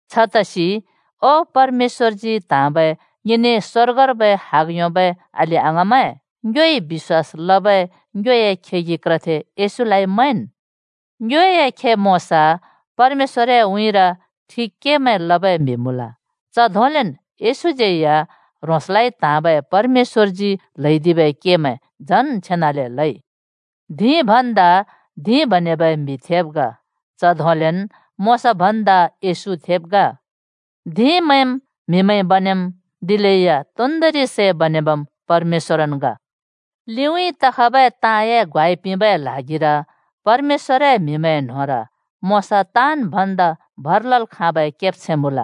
छतसि ओ परमेश्‍वरजी त्‍हाँबै ङिने स्वर्गर्बै हग योंबै अलि अङाँमैं, ङ्योइ बिश्‍वास लबै ङ्योए खेगि क्रथे येशूलाइ मैंन्। ङ्योए खे मोशा परमेश्‍वरए उँइँर ठिक केमैं लबै म्हि मुँल। च धोंलेन् येशूज्यै या ह्रोंसलाइ त्हाँबै परमेश्‍वरजी ल्हैदिबै केमैं झन् छेनाले लइ। धिं भन्दा धिं बनेबै म्‍हि थेब् ग। च धोंलेन मोशा भन्दा येशू थेब् ग। धिंमैंम् म्‍हिमैंइ बनेम्, दिलेया तोन्दोंरि सै बनेबम् परमेश्‍वरन् ग। लिउँइँ तखबै ताँए ग्वाइ पिंबै ल्हागिर परमेश्‍वरए म्हिमैंए न्होंर मोशा ताँन् भन्दा भर लल् खाँबै केब्छैं मुँल।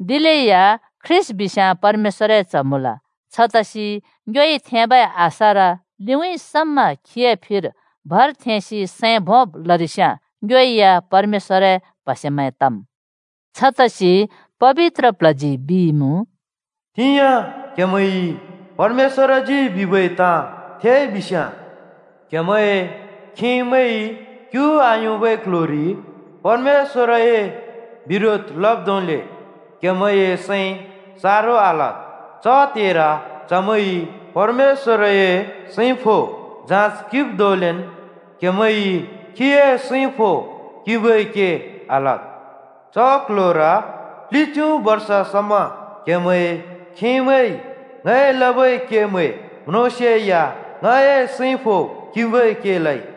दिलेया ख्रीष्‍ट बिस्याँ परमेश्‍वरए च्‍ह मुँल। छतसि ङ्योइ थेंबै आशार लिउँइँ समा खीए फिर भर थेंसि सैं भोंब् लरिस्याँ ङ्यो या परमेश्‍वरए प्हसेमैं तम्। छतसि पबित्र प्ल्हजी बिइमुँ, “तिंयाँ क्‍हेमैंइ परमेश्‍वरजी बिबै ताँ थेइबिस्‍याँ, क्‍हेमैंए खेमैंइ क्यु आयोंबै क्ल्ह्‍योरि परमेश्‍वरए बिरोध लब् धोंले क्‍हेमैंए सैं सारो आलद्, च त्हेर चमैंइ परमेश्‍वरए सैं फो (जाँच) किंब् धोंलेन् क्‍हेमैंइ खीए सैं फो किंबै के आलद्। च क्ल्ह्‍योर प्लिच्यु बर्ष समा क्हेमैंए खेमैंइ ङइ लबै केमैं म्रोंसेया ङए सैं फो किंबै के लइ।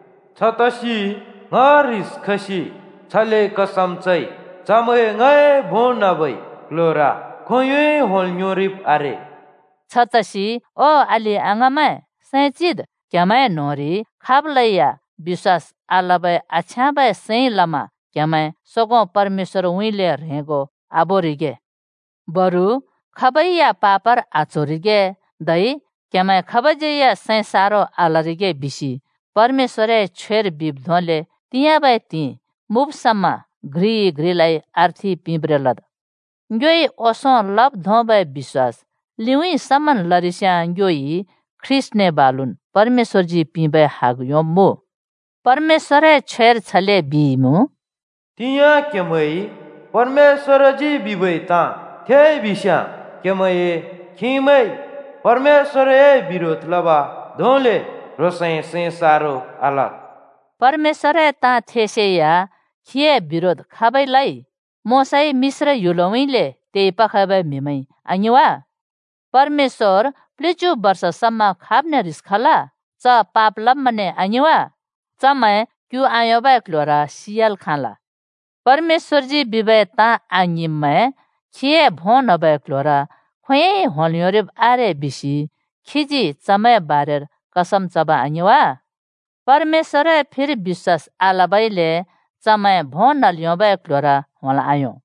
छतसि ङ ह्रिस खसि छले कसम चइ, ‘चमैं ङए भों न्‍हबै क्‍ल्‍ह्‍योर खोंयोंइ होंल् योंरिब् आरे।’” छतसि ओ अलि-अङाँमैं, सैं चिद्, क्‍हेमैं न्‍होंरि खाबलैया बिश्‍वास आलबै आछ्याँबै सैंइ लमा क्हेमैं सोगों परमेश्‍वरउँइँले ह्रेंगो आबोरिगे। बरु खाबै या पापर आच्होरिगे धै क्हेमैं खाबज्यै या सैं सारो आलरिगे बिसि परमेश्‍वरए छ्वेर बिब् धोंले “तिंयाँबै त्हिंइ” मुँब् समा घ्रिइ घ्रिलाइ अर्थि पिंब्रें लद्। ङ्योइ ओंसों लब् धोंबै बिश्‍वास लिउँइँ समन् लरिस्याँ, ङ्योइ ख्रीष्‍टने बालुन् परमेश्‍वरजी पिंबै हग योंब्‍मुँ। परमेश्‍वरए छ्वेर छले बिइमुँ, “तिंयाँ क्‍हेमैंइ परमेश्‍वरजी बिबै ताँ थेइ बिस्‍याँ, क्हेमैंए खेमैंइ परमेश्‍वरए बिरोध लब् धोंले ह्रोंसए सैं सारो आलद्।” परमेश्‍वरए ताँ थेसेया खीए बिरोध खाबइ लइ? मोशाइ मिश्र ह्‍युलउँइँले तेइ पखबै म्‍हिमैंइ, आङिं वा? परमेश्‍वर प्‍लिच्‍यु बर्ष समा खाबने ह्रिस खल? च पाप लब्‍मैंने आङिं वा? चमैं क्यु आयोंबै क्ल्ह्‍योर सियाल् खाँल। “परमेश्‍वरजी बिबै ताँ आङिंब्मैं खीए भों न्हबै क्‍ल्‍ह्‍योर खोंयोंइ होंल् योंरिब् आरे,” बिसि खीजी चमैंए बारेर कसम चब आङिं वा? परमेश्‍वरए फिर बिश्‍वास आलबइले चमैं भों न्हल् योंबै क्ल्ह्‍योर होंल् आयों।